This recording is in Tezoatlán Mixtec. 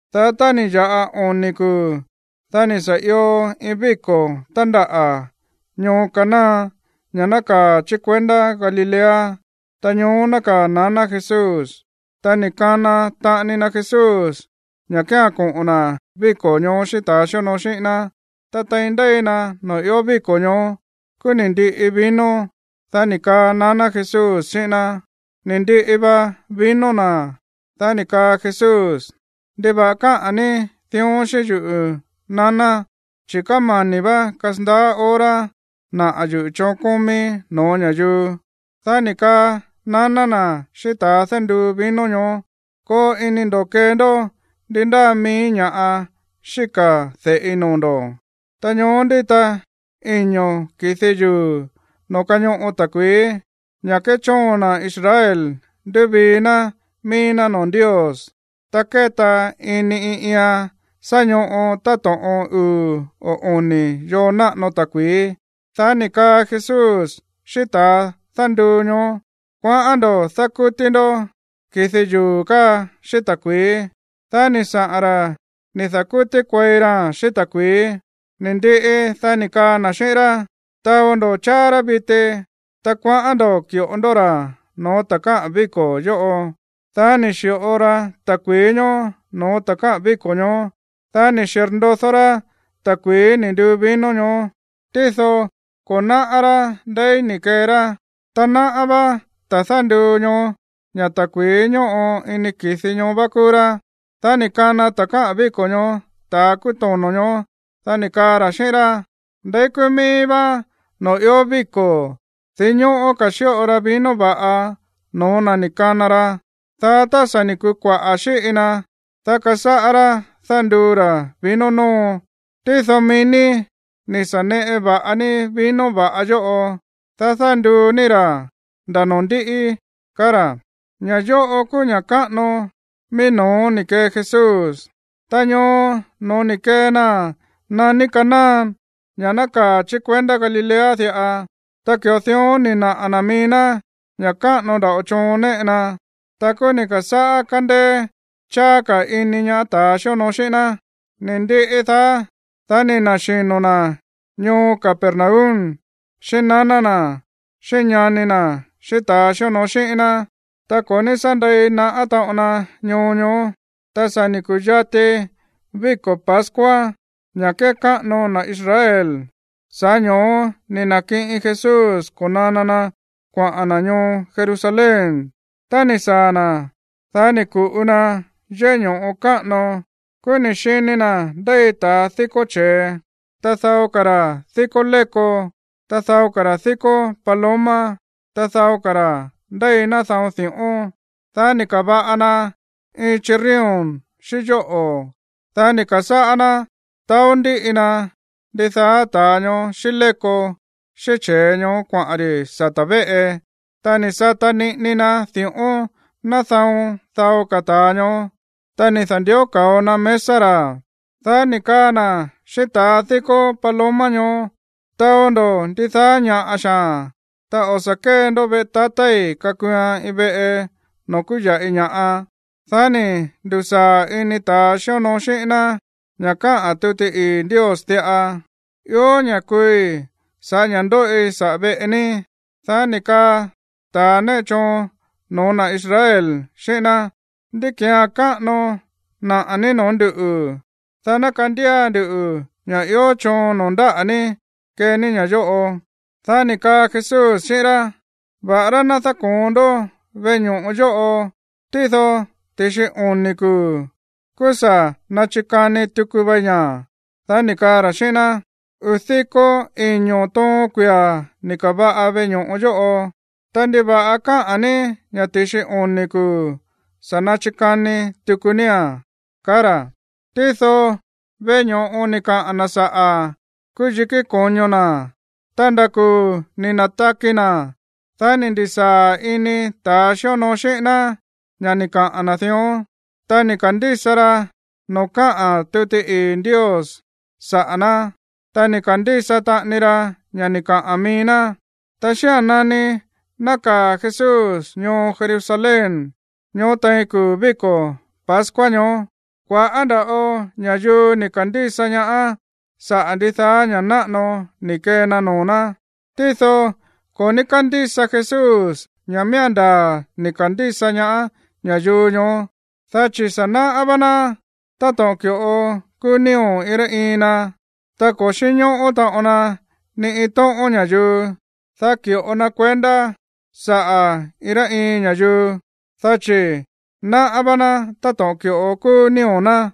Dá tá ni̱ ya̱ꞌa oni̱ kuu̱, dá ni̱ sa̱ io iin víko̱ tándaꞌa̱ ñoo Caná, ña̱ nákaa̱ chí kuendá Galilea, ta ñoó nákaa̱ naná Jesús. Ta ni̱ kana taꞌani na Jesús ña̱ kía̱n koꞌo̱n na̱ víko̱ ñoó xíꞌín ta̱ xíonoo xíꞌín ná. Ta tein ndéi na noo̱ ió víko̱ ñoó, kúú ni̱ ndiꞌi vino, dá ni̱ kaa naná Jesús xíꞌín ná: ―Ni̱ ndiꞌi va vino na̱. Dá ni̱ kaa Jesús: ―¿Ndiva̱ꞌa káꞌa̱n ní dión xíꞌín yuꞌu̱, naná? Chi̱ kámani̱ vá kasandaá hora naꞌa̱ yuꞌu̱ choon kómíí no̱ó ña̱yuu. Dá ni̱ kaa naná na̱ xíꞌín ta̱ dánduu vino ñoó: ―Koo ini ndo̱ kee ndó ndi ndáa mií ña̱ꞌa xíka̱ de̱ꞌi noo̱ ndo̱. Ta ñoó ndíta iño̱ ki̱di yuu̱ noo̱ kañoꞌo ta̱kui̱í, ña̱ kéchóon na̱ Israel ndúvii ná mií ná noo̱ Ndios. Ta kéta ini iin iian sá ñoꞌo táto̱ꞌon uu̱ o oni̱ yoo náꞌano ta̱kui̱í. Dá ni̱ kaa Jesús xíꞌín ta̱ dánduu ñoó: ―Kuaꞌán ndo̱ dákútí ndó ki̱di yuu̱ káa xíꞌín ta̱kui̱í. Dá ni̱ saꞌa̱n ra̱ ni̱ da̱kútí kuei raa̱n xíꞌín ta̱kui̱í. Ni̱ ndiꞌi, dá ni̱ kaa na̱ xíꞌín rá: ―Taó ndo̱ cháá rá viti, ta kuaꞌán ndo̱ ki̱ꞌo ndó ra̱ no̱ó ta̱ káꞌa̱n víko̱ yóꞌo. Dá ni̱ xi̱ꞌo ra ta̱kui̱í ñoó noo̱ ta̱ káꞌa̱n víko̱ ñoó. Dá ni̱ xirndodó rá ta̱kui̱í ni̱ nduu vino ñoó, tído ko̱ náꞌá rá ndeí ni̱ kee rá. Ta náꞌá vá ta̱ dánduu ñoó ña̱ ta̱kui̱í ñóꞌo ini ki̱di ñoó vá kúú rá. Dá ni̱ kana ta̱ káꞌa̱n víko̱ ñoó ta̱a kúú tono̱ ñoó, dá ni̱ kaa ra̱ xíꞌín rá: ―Ndeí kúú mií vá noo̱ ió víko̱, dinñóꞌó ka̱ xíꞌo ra vino va̱ꞌa no̱ó na̱ ni̱ kana ra, dá tá sa̱ ni̱ kuu kuaꞌa̱ xíꞌi na, dá kásáꞌá rá dánduu ra̱ vino nóo. Tído mií ní ni̱ sa̱ neꞌe va̱ꞌa ní vino va̱ꞌa yóꞌo, dá dánduu ní ra̱ nda̱ noo̱ ndíꞌí ―kaá ra̱. Ña̱ yóꞌo kúú ña̱ káꞌano mií no̱ó ni̱ kee Jesús. Ta ñoo no̱ó ni̱ kee naa̱n naní Caná, ña̱ nákaa̱ chí kuendá Galilea diꞌa. Ta ki̱ꞌo dión ni̱ naꞌa̱ na̱ mií ná ña̱ káꞌano nda̱ꞌo choon néꞌe na, ta kúú ni̱ ka̱sáꞌá kándéé cháá ka̱ iní ñaá ta̱ xíonoo xíꞌín ná. Ni̱ ndiꞌi daá, dá ni̱ na̱xino̱ na̱ ñoo Capernaum xíꞌín naná na̱ xíꞌín ñani na̱ xíꞌín ta̱ xíonoo xíꞌín ná, ta ko̱ ní sá ndei naꞌá taꞌon na ñoo ñoó. Ta sa̱ ni̱ ku̱yati víko̱ pascua, ña̱ kékáꞌano na̱ Israel, sa̱ꞌá ño̱ó ni̱ na̱kiꞌin Jesús ko̱nana na kuaꞌa̱n na̱ ñoo Jerusalén. Tá ni̱ saa̱ na̱, dá ni̱ ku̱ꞌu na yéꞌé ño̱ꞌo káꞌano, kúú ni̱ xini na̱ ndéi ta̱a díkó che̱e, ta dao ka̱ ra̱ díkó léko, ta dao ka̱ ra̱ díkó paloma, ta dao ka̱ ra̱ ndéi nádaon di̱ꞌón. Dá ni̱ ka̱va̱ꞌa na iin chirrión xíꞌín yóꞌo̱, dá ni̱ ka̱sáꞌá ná taó ndíꞌi na ndidaá ta̱ ñoó xíꞌín léko, xíꞌín che̱e ñoó kuaꞌa̱n ri̱ sata̱ véꞌe, ta ni̱ sata niꞌini na di̱ꞌón nádaon dao ka̱ ta̱a ñoó, ta ni̱ da̱ndió ka̱o na mesa ra̱; dá ni̱ kaa na̱ xíꞌín ta̱ díkó paloma ñoó: ―Taó ndó ndidaá ña̱ꞌa xaa̱n, ta o̱ sa̱ kée ndó veꞌe tatái̱ kakuuan iin veꞌe noo̱ kúya̱ꞌi ña̱ꞌa. Dá ni̱ ndu̱saa̱ ini ta̱ xíonoo xíꞌín ná ña̱ káꞌa̱n tuti ii̱ Ndios diꞌa: “Ió ña̱ kuui̱ sa̱ꞌá ña̱ ndóꞌi saꞌa̱ veꞌe ní.” Dá ni̱ kaa ta̱ néꞌe choon no̱ó na̱ Israel xíꞌín ná: ―¿Ndí ki̱án káꞌano naꞌa̱ ní noo̱ ndúꞌu̱, dá ná kandía nduꞌu̱ ña̱ ió choon noo̱ ndáꞌa̱ ní kee ní ña̱ yóꞌo? Dá ni̱ kaa Jesús xíꞌín rá: ―Va̱ꞌará ná dáko̱on ndó veꞌe ño̱ꞌo yóꞌo, tído ti̱xi oni̱ kuu̱, kúú sa̱ nachikani tuku vei ña̱. Dá ni̱ kaa ra̱ xíꞌín ná: ―Uu̱ diko iño̱ toon kuia̱ ni̱ ka̱va̱ꞌa veꞌe ño̱ꞌo yóꞌo; ta, ¿ndiva̱ꞌa káꞌa̱n ní ña̱ ti̱xi oni̱ kuu̱ sa̱ nachikani tuku nía̱n? ―kaá ra̱. Tído veꞌe ño̱ꞌo ni̱ kaꞌa̱n na̱ saꞌa̱ kúú yikí ko̱ño na̱. Ta nda̱ kuu̱ ni̱ na̱taki na̱, dá ni̱ ndi̱saa̱ ini ta̱ xíonoo xíꞌín ná ña̱ ni̱ kaꞌa̱n na̱ dión, ta ni̱ ka̱ndísa ra noo̱ káꞌa̱n tuti ii̱ Ndios saꞌa̱ ná, ta ni̱ ka̱ndísa taꞌani ra ña̱ ni̱ kaꞌa̱n mií ná. Ta xía̱n nani nákaa̱ Jesús ñoo Jerusalén ñoó tein kuu̱ víko̱ pascua ñoó, kua̱ꞌá nda̱ꞌo ña̱yuu ni̱ ka̱ndísa ñaá sa̱ꞌá ndidaá ña̱ náꞌano ni̱ kee na noo̱ ná. Tído ko̱ ní kándísa Jesús ña̱ miía̱n ndaa̱ ni̱ ka̱ndísa ñaá ña̱yuu ñoó, dá chi̱ sa̱ náꞌá vá ná táto̱ꞌon ki̱ꞌo kúú nío̱ iin rá iin na, ta ko̱ xínñóꞌó taꞌon na ni iin tóꞌón ña̱yuu, dá ki̱ꞌo na kuendá saꞌa̱ iin rá iin ña̱yuu, dá chi̱ náꞌá vá ná táto̱ꞌon ki̱ꞌo kúú nío̱ ná.